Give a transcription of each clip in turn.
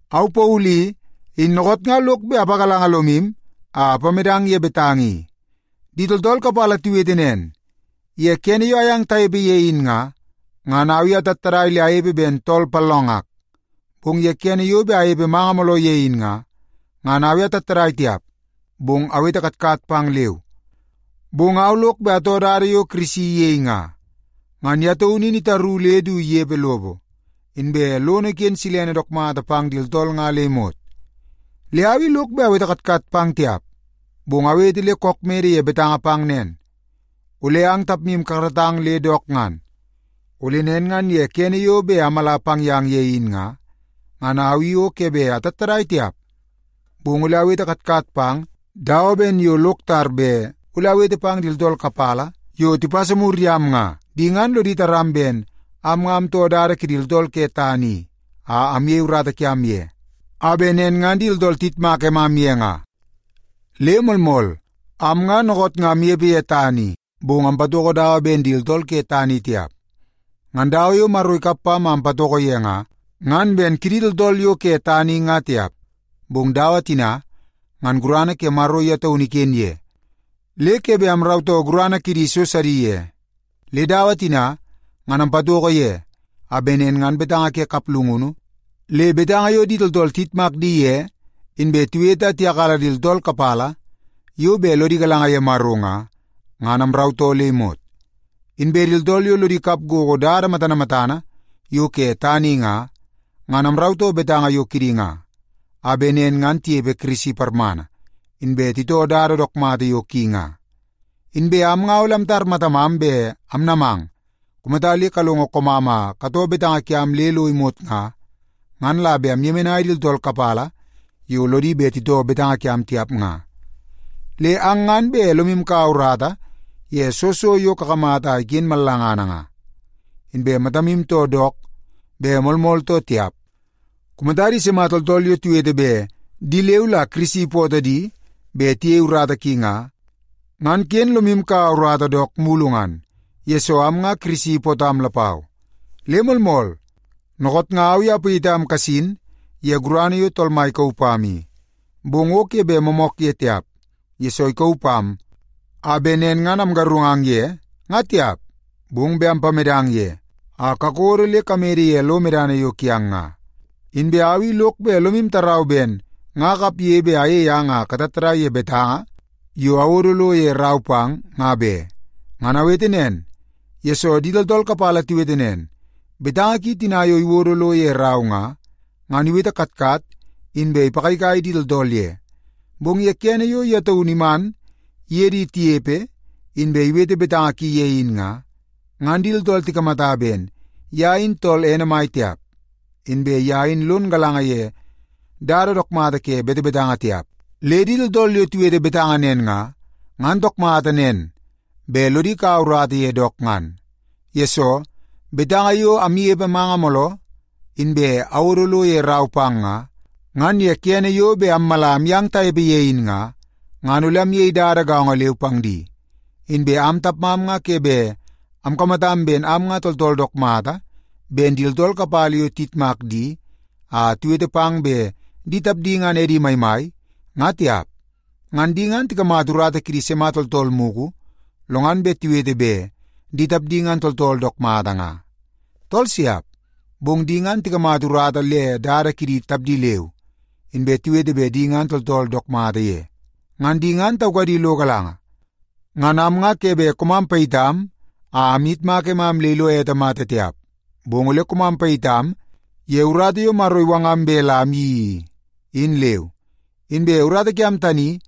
Au Paulu i, in dookoot nga lok bet apagalanga lomu a apamedang ye betanga i. Di tooltool kapala tiwete nen, ye kene yo ayang tanepe ye in nga, ngan au i atattadai le anepe ben tool pallongak, bong ye kene yo bet anepe manga mooloo ye in nga, ngan au i atattadai tiap, bong awete katkat pang leu. Bong au lok bet atoo dada yo Kirisi iyei nga, ngan ye taunu in itaru le du inepe lopo, inbe lono iken silene dook mata pang di tooltool nga le imot. Le au i lok bet awete katkat pang tiap, bong awete le kook mede ye betanga pang nen, ole ang tapmu kakaratang le dook ngan. Ole nen ngan ye kene yo bet amala pang yang ye in nga, ngan au i o ke bet atattadai tiap, bong ole awete katkat pang dawa ben yo lok tar bet ole awete pang di tooltool kapala yo tipasa mur yam nga. Di ngan lodi taram ben am nga amtoo dada kidi tooltool ke tana i a amyei urata kiam ye, a bet nen ngan di tooltool tiyitmak emam ye nga. Le moolmool, am nga dookoot nga amnepe ye tana i, bong ampatoko dawa ben di tooltool ke tana i tiap. Ngan dawa yo Maro ikap pam a ampatoko ye nga, ngan ben kidi tooltool yo ke tana i nga tiap. Bong dawa tina ngan gurana ke Maro ye taunu iken ye, le ke bet amrautoo gurana kidi so sidi ye. Le dawa tina, ngan ampatoko ye a bet nen ngan betanga ke kaplungunu, le betanga yo di tooltool tiyitmak di ye inbe tiwete a tiyakala di tooltool kapala yo bet lodi galanga ye Maro nga, ngan amrautoo le imot. Inbe di tooltool yo lodi kap gogo dada matana matana yo ke tana i nga, ngan amrautoo betanga yo kidi nga, a bet nen ngan tinepe Kirisi parmana, inbe titoo dada dook mata yo ki nga. Inbe am nga ole amtar matamam bet amnamang kumata le kalongo koomam a katoo betanga kiam le lo imot nga, ngan la bet amyemenai di tooltool kapala yo lodi bet titoo betanga kiam tiap nga. Le ang ngan bet lomu kaua urata ye soo so yo kakamata a iken mallangana nga, inbe matamu too dook bet moolmool too tiap. Kumata di sima tooltool yo tiwete bet di leu la Kirisi ipootoo di bet tiyei urata ki nga, ngan ken lodi kaua urata dook mulu ngan, yesoo am nga Kirisi ipootam lapau. Le moolmool, dookoot nga au i apayitam kasin ye gurana yo Tool Mai ikauu pam i. Bong o ke bet moomook ye tiap, yesoo ikauu pam a bet nen ngan amgarungang ye nga tiap, bong bet ampamedang ye a kakodo le kamede ye lo medana yo kiang nga. Inbe au i lok bet lomu tarau ben nga akapge bet ayei ang a katattadai ye betanga yo awodo lo ye rau pang nga be. Ngan awete nen, yesoo di tooltool kapala tiwete nen, “Betanga ki tina yo iwodo lo ye rau nga, ngan iwete katkat inbe ipagaigai di tooltool ye. Bong ye kene yo ye taunu iman iye di tinepe inbe iwete betanga ki ye in nga, ngan di tooltool tikamata ben ye in tool ene mai tiap, inbe ye in lon galanga ye dada dook mata ke betebetanga tiap.” Le di tooltool yo tiwete betanga nen nga, ngan dook mata nen bet lodi kaua urata ye dook ngan. Yesoo, betanga yo amnepe manga mooloo, inbe awodo lo ye rau pang nga, ngan ye kene yo bet ammala amyang tanepe ye in nga, ngan ole amyei dada gaongo leu pang di. Inbe am tapmam nga ke bet amkamatam ben am nga tooltool dook mata ben di tooltool kapala yo tiyitmak di a tiwete pang bet di tapdi ngan edi maimai, nga tiap. Ngan di ngan tikamata urata kidi sima tooltool mugu, lo ngan bet tiwete bet di tapdi ngan tooltool dook mata nga? Tool siap! Bong di ngan tikamata urata le dada kidi tapdi leu, inbe tiwete bet di ngan di tooltool dook mata ye. Ngan di ngan taukadi lo galanga. Ngan am nga ke bet koomam payitam a amyitmak emam le ilo ete mata tiap, bong ole koomam payitam ye urata yo Maro iwangam bet la amyeii i, in leu. Inbe urata kiam tani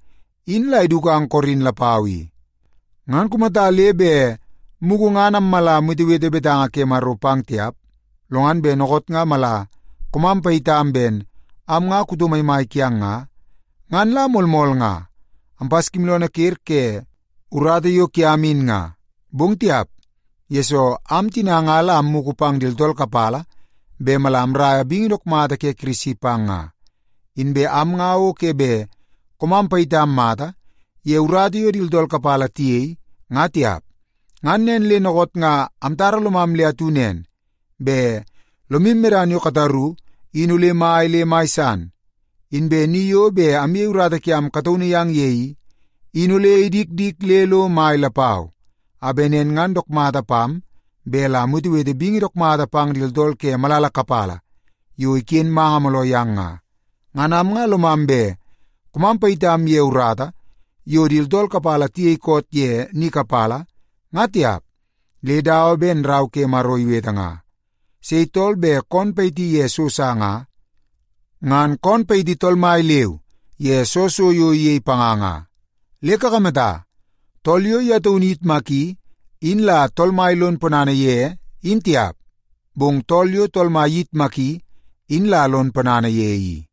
in la idukang Korin lapau i. Ngan kumata le bet mugu ngan ammala amwetewete betanga ke Maro pang tiap, lo ngan bet dookoot nga mala koomam payitam ben am nga kuto maimai kiang nga, ngan la moolmool nga ampaskimooloonoo ker ke urata yo kiam in nga. Bong tiap, yesoo am tina nga la ammugu pang di tooltool kapala bet mala amraia bingi dook mata ke Kirisi pang nga. Inbe am nga o ke bet koomam payitam mata ye urata yo di tooltool kapala tiyei nga tiap. Ngan nen le dookoot nga amtara lomam le atu nen bet lomu medana yo kataru in ole mai le mai san, inbe ni yo bet amyei urata kiam kataunu yang ye i, in ole idikdik le lo mai lapau, a bet nen ngan dook mata pam bet la amwetewete bingi dook mata pang di tooltool ke malala kapala yo iken manga mooloo yang nga. Ngan am nga lomam bet koomam payitam ye urata yo di tooltool kapala tiyei koot ye ni kapala, nga tiap. Le dawa ben tina Rau ke Maro iwete nga, “Sei tool bet koon payiti ye so sa nga, ngan koon payiti Tool Mai leu ye soo so yo iyei panga nga.” Le kakamata, tool yo ye taunu iyitmaki in la Tool Mai lon ponana ye, in tiap, bong tool yo Tool Mai iyitmaki in la lon ponana ye i.